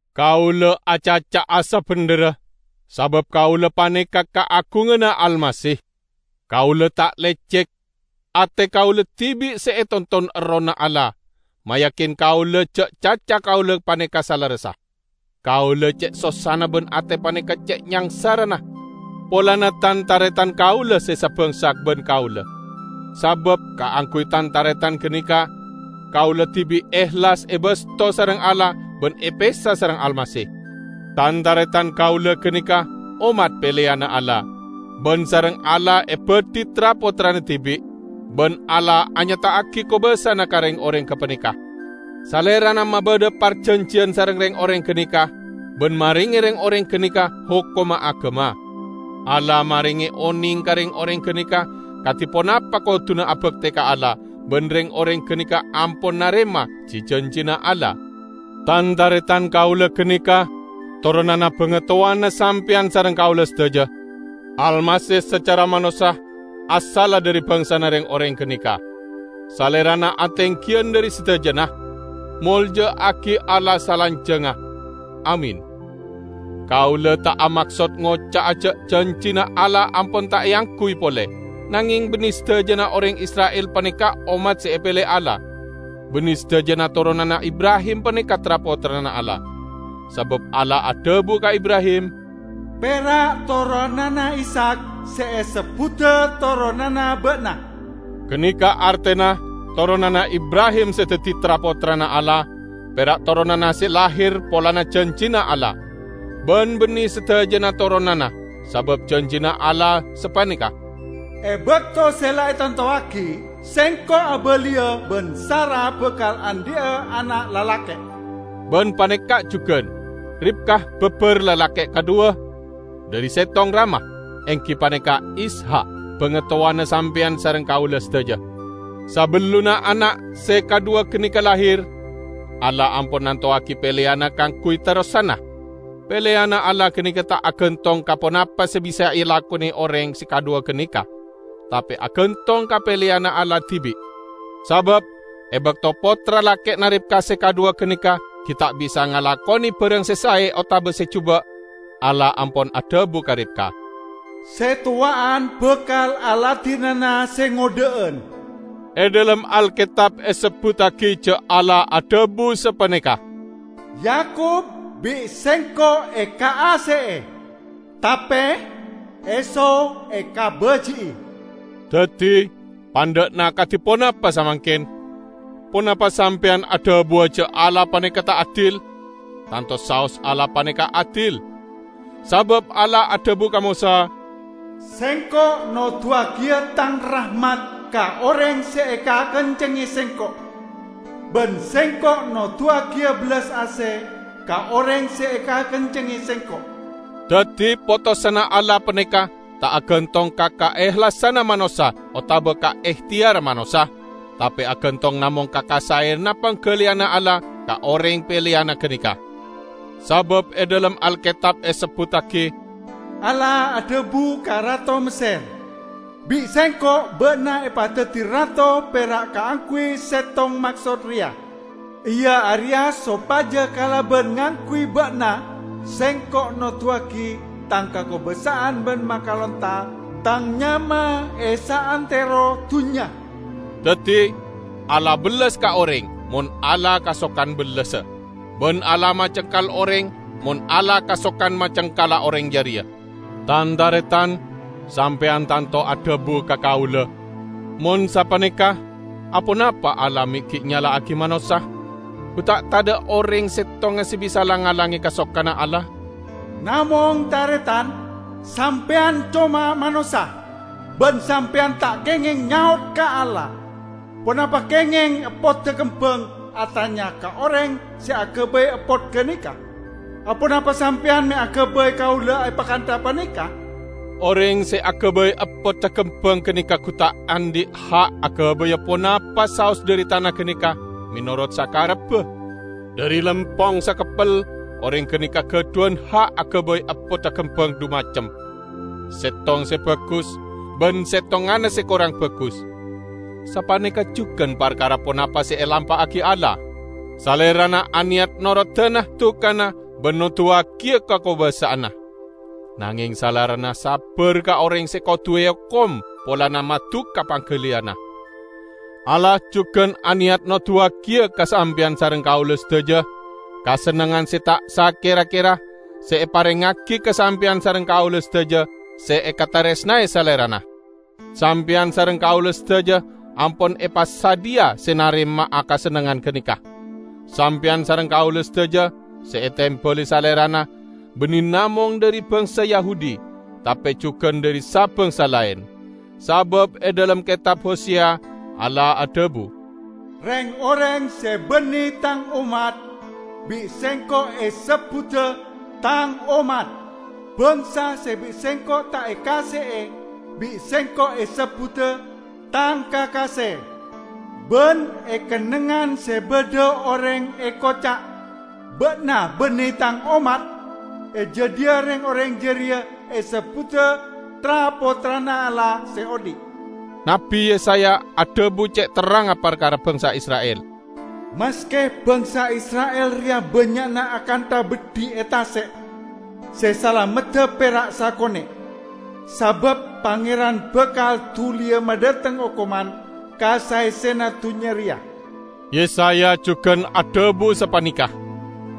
Kaula acaca'a sabendherra, sabab kaula paneka kaagunganna Almasih. Kaula ta' lecek. Ate kaula dibi' se etonton Errohna Allah, mayakin kaula ja' caca kaula paneka salerressa. Kaula ce' sossana ban ate paneka ce' nyangsarana polana tan-taretan kaula se sabangsa ban kaula. Sabab kaangguy tan-taretan ganeka, kaula dibi' ehlas ebasto sareng Allah ban epesa sareng Almasih. Tan-taretan kaula ganeka ommat peleyanna Allah, ban sareng Allah ebadhi tra-pottrana dibi', ban Allah anyata'agi kobasana ka reng-oreng gapaneka. Salerana mabadha parjanjiyan sareng reng-oreng ganeka, ban marenge reng-oreng ganeka hokomma agama. Allah marenge oneng ka reng-oreng ganeka kadi ponapa koduna abakte ka Allah ban reng-oreng ganeka ampon narema ji-janjina Allah. Tan-taretan kaula ganeka toronanna bangatowana sampeyan sareng kaula sadaja. Almasih sacara manossa asalla dhari bangsana reng-oreng ganeka. Salerana atenggiyan dhari sadajana. Molja'agi Allah salanjangnga. Amin! Kaula ta' amaksod ngoca'a ja' janjina Allah ampon ta' eangguy pole; nangeng banne sadajana oreng Isra'il paneka ommat se epele Allah. Banne sadajana toronanna Ibrahim paneka tra-pottrana Allah. Sabab Allah adhabu ka Ibrahim, "Pera' toronanna Ishak se esebbuda toronanna ba'na." Ganeka artena toronanna Ibrahim se daddi tra-pottrana Allah pera' toronanna se lahir polana janjina Allah; ban banne sadajana toronanna. Sabab janjina Allah sapaneka, "E bakto se la etantowagi, Sengko' abaliya, ban Sara bakal andhi'a ana' lalake'." Ban paneka' jugan: Ribka babar lalake' kadhuwa dhari settong rama, enggi paneka Ishak, bangatowana sampeyan sareng kaula sadaja. Sabellunna ana' se kadhuwa ganeka lahir, Allah ampon nantowagi peleyanna kaangguy terrosanna. Peleyanna Allah ganeka ta' agantong ka ponapa se bisa elakone oreng se kadhuwa ganeka, tape agantong ka peleyanna Allah dibi'. Sabab e bakto pottra lake'na Ribka se kadhuwa ganeka gi' ta' bisa ngalakone barang se sae otaba se juba', Allah ampon adhabu ka Ribka, "Se towa'an bakal aladinana se ngodha'an." E dhalem Alketab esebbuttagi ja' Allah adhabu sapaneka, "Yakub bi' Sengko' ekaase'e, tape Esau ekabaji'i." Daddi, pandha'na kadi ponapa samangken? Ponapa sampeyan adhabuwa ja' Allah paneka ta' adil? Tanto saos Allah paneka adil! Sabab Allah adhabu ka Mosa, "Sengko' noduwagiya Tang rahmat ka oreng se ekakencengnge Sengko', ban Sengko' noduwagiya bellas ase ka oreng se ekakencengnge Sengko'." Daddi potosanna Allah paneka ta' agantong ka kaehlasanna manossa otaba ka ehteyarra manossa, tape agantong namong ka kasaeyanna panggaliyanna Allah ka oreng peleyanna ganeka. Sabab e dhalem Alketab esebbuttagi, "Allah adhabu ka Rato Messer, 'Bi' Sengko' ba'na epadaddi rato pera' kaangguy settong maksod reya, iya areya sopaja kalaban ngangguy ba'na Sengko' noduwagi Tang kakobasa'an ban makalonta Tang nyama e saantero dunnya.' " Daddi, Allah bellas ka oreng, mon Allah kasokan bellasa. Ban Allah macengkal oreng, mon Allah kasokan macengkala oreng jareya. Tan-taretan, sampeyan tanto adhabu ka kaula, "Mon sapaneka, aponapa Allah me' gi' nyala'agi manossa? Gu ta' tadha' oreng settonga se bisa lang-ngalange kasokanna Allah?" Namong, Taretan! Sampeyan coma manossa. Ban sampeyan ta' kengeng nyaot ka Allah! Ponapa kengeng eppodda kembang atanya ka oreng se agabay eppot ganeka, "Aponapa sampeyan me' agabay kaula epakantha paneka?" Oreng se agabay eppodda kembang ganeka gu ta' andhi' ha' agabaya ponapa saos dhari tana ganeka menorot sakarebba. Dhari lempong sakeppel oreng ganeka gadhuwan ha' agabay eppodda kembang dhu macem: settong se bagus, ban settonganna se korang bagus. Sapaneka jugan parkara ponapa se elampa'agi Allah. Salerana aneyat norodana dukana ban noduwagiya kakobasa'anna. Nangeng Salerana sabbar ka oreng se kodu eokom polana maduka panggaliyanna. Allah jugan aneyat noduwagiya ka sampeyan sareng kaula sadaja kasennengngan se ta' sakera-kera se eparengngagi ka sampeyan sareng kaula sadaja se ekataresnae Salerana. Sampeyan sareng kaula sadaja ampon epasadhiya se narema'a kasennengngan ganeka. Sampeyan sareng kaula sadaja se etembali Salerana; banne namong dhari bangsa Yahudi, tape jugan dhari sa-bangsa laen. Sabab e dhalem Ketab Hoseya, Allah adhabu, "Reng-oreng se banne Tang ommat, bi' Sengko' esebbuda 'Tang ommat'. Bangsa se bi' Sengko' ta' ekaase'e, bi' Sengko' esebbuda 'Tang kakase'. Ban e kennengngan se badha oreng ekoca', 'Ba'na banne Tang ommat,' e jadhiya reng-oreng jareya esebbuda tra-pottrana Allah se odhi'." Nabbi Yesaya adhabu ce' terrangnga parkara bangsa Isra'il, "Maske bangsa Isra'il reya bannya'na akantha beddhi e tase', se salamedda pera' sakone'; sabab Pangeran bakal duliya madhateng okoman ka saessena dunnya reya." Yesaya jugan adhabu sapaneka,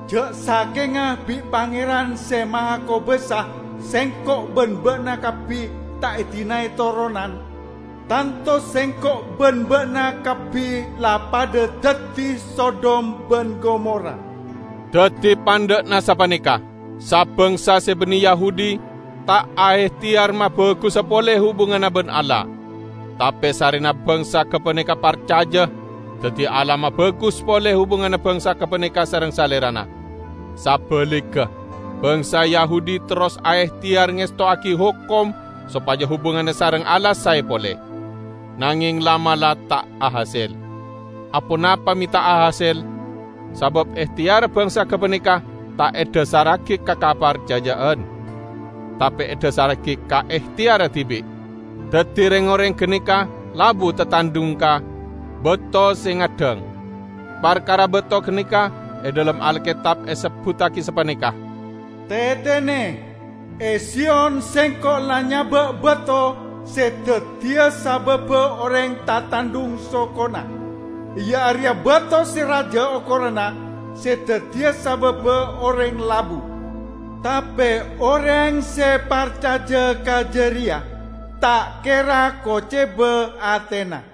"Ja' sakenga bi' Pangeran Se Mahakobasa sengko' ban ba'na kabbi ta' edinae toronan, tanto sengko' ban ba'na kabbi la padha daddi Sodom ban Gomora." Daddi, pandha'na sapaneka: Sa-bangsa se banne Yahudi ta' aehteyar mabagusa pole hubunganna ban Allah. Tape sarrena bangsa gapaneka parcaja, daddi Allah mabagus pole hubunganna bangsa gapaneka sareng Salerana. Sabaligga, bangsa Yahudi terros aehteyar ngestowagi hokom sopaja hubunganna sareng Allah sae pole. Nangeng la'-mala' ta' ahasel. Aponapa me' ta' ahasel? Sabab ehteyarra bangsa gapaneka ta' edhasarragi ka kaparcaja'an, tape edhasarragi ka ehteyarra dibi'. Daddi reng-oreng ganeka labu tatandhung ka "Bato Se Ngaddhang". Parkara bato ganeka e dhalem Alketab esebbuttagi sapaneka, "Tetene: E Siyon Sengko' la nyaba' bato se daddiya sababba oreng tatandhung sokona; iya areya bato se raja okoranna se daddiya sababba oreng labu. Tape oreng se parcaja ka jareya ta' kera koceba atena."